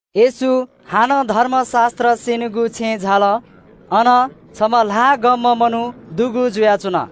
येशू हानं धर्मशास्त्र स्यनीगु छेँय् झाल। अन छम्ह ल्हाः गंम्ह मनू दुगु जुयाच्वन।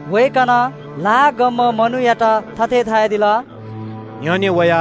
वय्कलं ल्हाः गंम्ह मनूयात धयादिल – “न्ह्यःने वा।”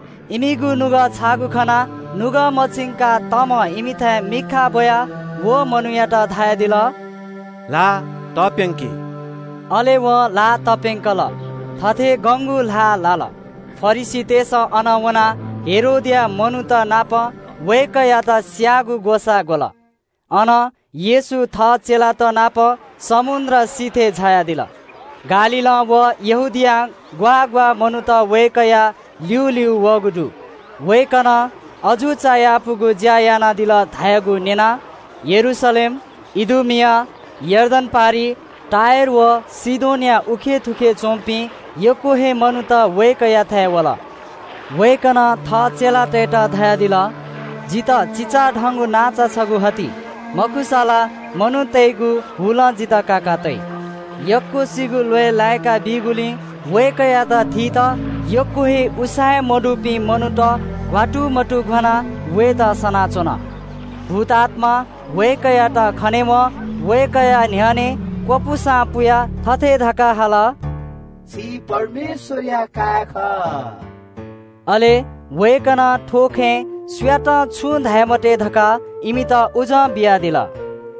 इमिगु नुगः छाःगु खनाः नुगः मछिंकाः तमं इमिथाय् मिखा ब्वयाः व मनूयात धयादिल – “ल्हाः तप्यंकी।” अले वं ल्हाः तप्यंकल। थथे गंगु ल्हाः लाल। फरिसीतय्सं अनं वनाः हेरोदया मनूत नाप वय्कःयात स्यायेगु ग्वसाः ग्वल। अनं येशू थः चेलात नाप समुद्र सिथय् झायादिल। गालीलं व यहूदियां ग्वाः ग्वाः मनूत वय्कःया ल्यूल्यू वःगु दु। वय्कलं अजू चायापुगु ज्या यानादिल धयागु न्यनाः यरूशलेम, इदुमिया, यर्दन पारिइ, टुरोस व सीदोनया थुखे उखे च्वंपिं यक्व हे मनूत वय्कःयाथाय् वल। वय्कलं थः चेलातय्त धयादिल – “जितः चिचाधंगु नांचा छगू हति, मखुसा ला मनूतय्गु हुलं जितः काकातइ।” यक्वसिगु ल्वय् लाय्का ब्यूगुलिं वय्कःयात थीत यक्व हे उसाँय्मदुपिं मनूत घ्वात्तुमतुघ्वानाः वयेत सनाच्वन। भूतआत्मां वय्कःयात खनेवं वय्कःया न्ह्यःने क्वपुसां पुयाः थथे धकाः हाल – “छि परमेश्वरया काय् खः।” अले वय्कलं थ्व खँय् सुयातं छुं धाये मते धकाः इमित उजं बियादिल।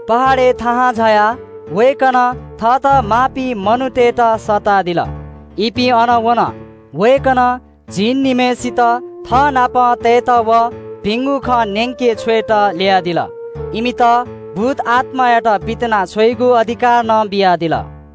पहाडय् थाहां झायाः वय्कलं थःत माःपिं मनूतय्त सःतादिल। इपिं अन वन। वय्कलं झिंनिम्हय्सित थःनाप तयेत व भिंगु खँ न्यंके छ्वयेत ल्ययादिल। इमित भूतआत्मायात पितिनाछ्वयेगु अधिकार नं बियादिल।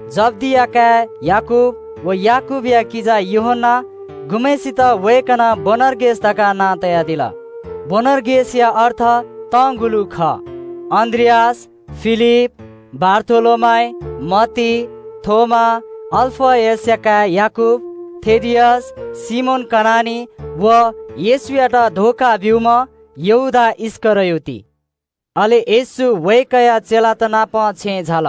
जब्दिया काय् याकूब व याकूबया किजा यूहन्ना, गुम्हय्सित वय्कलं बोअनर्गेस धकाः नां तयादिल, (बोअनर्गेसया अर्थ तंगुलु खः), अन्द्रियास, फिलिप, बारथोलोमाइ, मत्ती, थोमा, अल्फयसया काय् याकूब, थेदियस, सिमोन कनानी व येशूयात धोखा ब्यूम्ह यहूदा इस्करियोत। अले येशू वय्कःया चेलात नाप छेँय् झाल।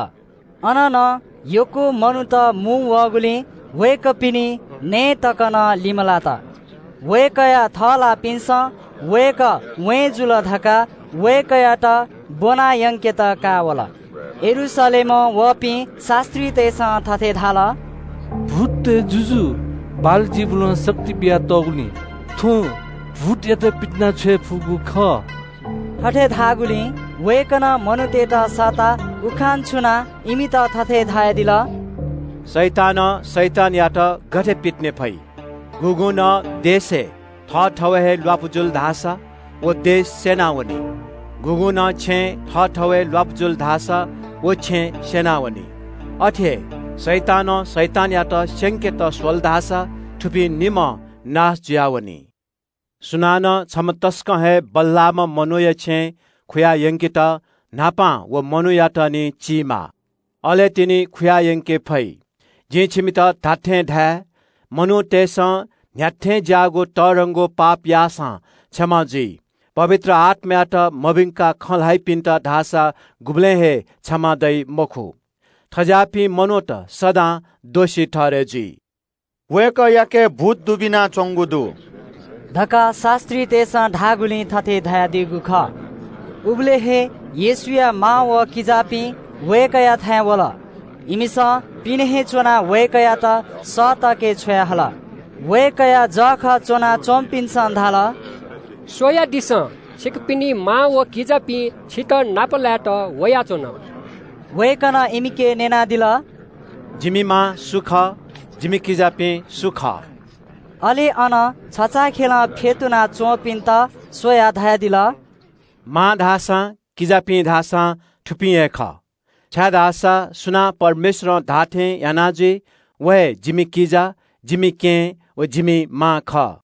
अन नं यक्व मनूत मुंवःगुलिं वय्कःपिनि नये तक नं लिमलात। वय्कःया थःलाःपिन्सं वय्कः वें जुल धकाः वय्कःयात ब्वनायंकेत का वल। यरूशलेमं वःपिं शास्त्रीतय्सं थथे धाल – “भूततय् जुजु बालजिबुलं शक्ति बियातःगुलिं थ्वं भूतयात पितिनाछ्वये फुगु खः।” थथे धाःगुलिं वय्कलं मनूतय्त सःता उखान छुनाः इमित थथे धयादिल – “शैतानं शैतानयात गथे पितिने फइ? गुगुं नं देशय् थःथवय् हे ल्वापु जुल धाःसा व देश स्यनावनी। गुगुं नं छेँय् थःथवय् ल्वापु जुल धाःसा व छेँ स्यनावनी। अथे हे शैतानं शैतानयात स्यंकेत स्वल धाःसा थुपिं निम्हं नाश जुयावनी। सुनानं छम्ह तसकं हे बल्लाःम्ह मनूया छेँय् खुयायंकेत न्हापां व मनूयात निं चीमाः, अले तिनि खुयायंके फइ। “जिं छिमित धात्थें धाये – मनूतय्सं न्ह्याथें ज्याःगु तःधंगु पाप याःसां क्षमा जुइ, पवित्र आत्मायात मभिंकाः खँ ल्हाइपिन्त धाःसा गुबलें हे क्षमा दइ मखु। थज्याःपिं मनूत सदां दोषी ठहरय् जुइ।” वय्कःयाके भूत दुबिनाच्वंगु दु धकाः शास्त्रीतय्सं धाःगुलिं थथे धयादीगु खः। उबलय् हे येशूया मां व किजापिं वय्कःयाथाय् वल। इमिसं पिने हे च्वनाः वय्कःयात सःतके छ्वयाहल। वय्कःया जःखः च्वनाच्वंपिन्सं धाल – “स्वयादिसँ, छिकपिनि मां व किजापिं छितः नापलायेत वयाच्वन।” वय्कलं इमिके न्यनादिल – “जिमि मां व जिमि किजापिं सु खः?” अले अन छचाःखेलं फ्यतुना च्वंपिन्त स्वयाः धयादिल – “मां धाःसां, किजापिं धाःसां थुपिं हे खः, छाय्धाःसा सुनां परमेश्वरं धाःथें याना जुइ, व हे जिमि किजा, जिमि केहेँ, व जिमि मां खः।”